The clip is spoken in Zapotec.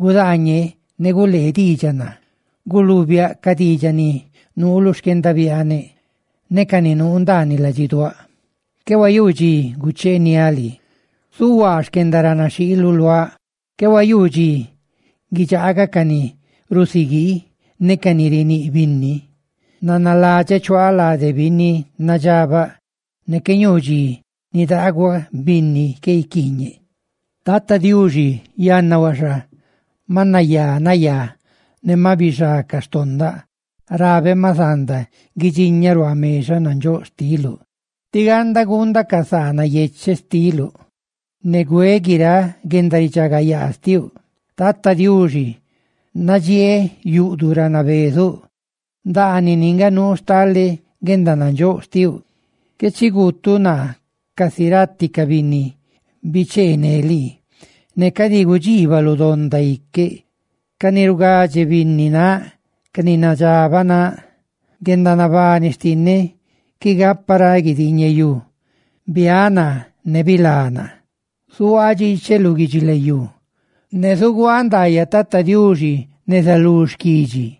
gudaañe, ¡ne gulee diidxaꞌ naa!, ¡guluubiáꞌ ca diidxaꞌ ni nuu lu xquendabiaaneꞌ ne ca ni nuu ndaaniꞌ ladxiduáꞌ! Qué huayuu dxi gucheeniáꞌ lii zuhuaa xquendaranaxhiiluꞌ luaꞌ; qué huayuu dxi guidxaagaꞌ ca ni rusiguii ne ca ni riníꞌ binni. Nanaladxeꞌ chuaaꞌ lade binni nadxabaꞌ; ¡ne qué ñuu dxi nidaaguaꞌ binni qué guiquiiñeꞌ! Tata Diuxi, yanna huaxa ma nayá nayaꞌ ne maꞌ bixá ca xtondaꞌ, rabeꞌ ma zanda guidxiñaꞌ ruaa mexaꞌ nandxóꞌ xtiluꞌ, tí ganda guundaꞌ ca saa nayecheꞌ xtiluꞌ, ne güeꞌ guiráꞌ guendaridxagayaa xtiuꞌ. Tata Diuxi, nadxieeꞌ yuꞌduꞌ ra nabezuꞌ, ndaanini nga nuu stale guendanandxóꞌ xtiuꞌ. Qué chi guutuꞌ naa casi rati ca binni bichee ne lii; ne cadi gudxiibaluꞌ donda iqueꞌ, ca ni rugadxe binni náꞌ, ca ni nadxabaꞌ náꞌ. Guendanabani xtinneꞌ qui gapa ra guidiiñeyú; ¡biaꞌ naa, ne bilá naa! Zuhuaaꞌ dxiicheꞌ lu guidxilayú; ¡ne zuguaaꞌ ndaayaꞌ Tata Diuxi neza lú xquidxi!